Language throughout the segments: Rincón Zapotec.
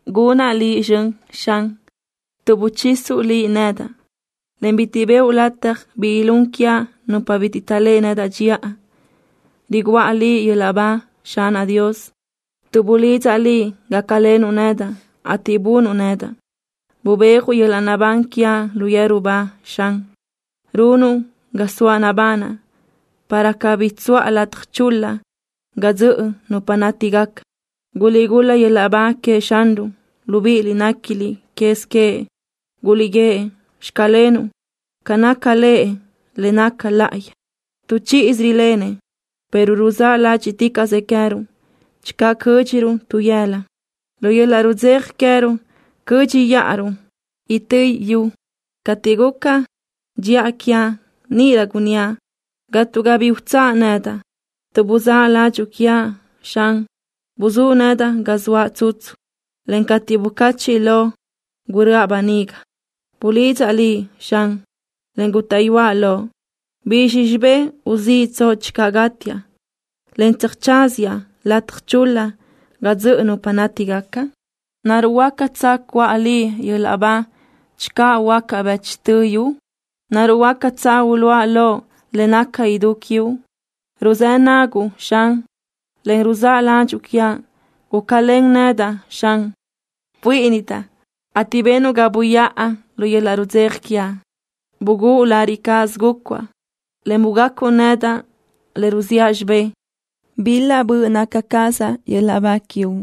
Gunaʼ Liʼ zxön, Xan, tuʼ buchisuʼ Liʼ nedaʼ, en bitiʼ bëʼu lataj bi ilún quiaʼ nupa bitiʼ taʼléʼe nedaʼ dxiʼa. Riguʼa Liʼ yöl-laʼ ba, Xanaʼ Dios, tuʼ bulidzaʼ Liʼ gácalenuʼ nedaʼ, ateʼ bunuʼ nedaʼ. Bubéajuʼ yöl-laʼ naʼbán quiaʼ lu yeru ba, Xan. Runuʼ ga zoaʼ nabanaʼ, para cabí tsuʼa lataj chul-la ga dzöʼö nupa nátigaca. ¡Guliʼgul-la yöl-laʼ ba queëʼ Xanruʼ, libíʼiliʼ néquiliʼ quez queëʼ! ¡Guliʼguíëʼ: “Xclenuʼ” ca naca Lëʼ le naca láʼayi! Tu chíʼisö rilenëʼ, pero ruzáʼ ládxiʼticaʼsëʼ queë́ruʼ. Channö cö́dxiruʼ tu yëla, lu yöl-laʼ rudzeja queë́ruʼ cö́dxiʼaruʼ itö́ yu. Cateʼ guca dxiʼa quiaʼ, níʼirö gunníaʼ: “Gatga bi utsáʼ nedaʼ.” Tuʼ buzáʼ ládxuʼu quiaʼ, Xan, buzúʼ nedaʼ ga zoaʼ tsutsu, en cateʼ bucachiʼ loʼ, guröʼa böniga. Bulidzaʼ Liʼ, Xan, en gútaʼyuaʼ loʼ. ¿Bizxi xibé uziʼtsoʼ channö gátiaʼ, en tsöjtsáziaʼ lataj chul-la ga dzöʼö nupa nátigaca? ¿Naruʼ huácatsö cuʼa Liʼ yöl-laʼ ba channö huöácaʼ bëchtö yu? ¿Naruʼ huácatsö uluʼa lo le naca idú quiuʼ? Ruzë́ naguʼ, Xan, en ruzáʼ ládxuʼu quiaʼ. Gúcalen nedaʼ, Xan. Buíʼinidaʼ, ateʼ benuʼ ga buyáʼa lu yöl-laʼ rudzeja quiaʼ. Bugúʼ lariʼ cáʼasö gúcuaʼ, en bugacuʼ nedaʼ le ruziʼa xibé. Bil-la böʼ naca cazaʼ yöl-laʼ ba quiuʼ,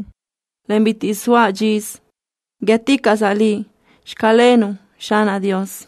en bitiʼ soa dxisö. Guíëticaʼsaʼ Liʼ: “Xclenuʼ”, Xanaʼ Dios.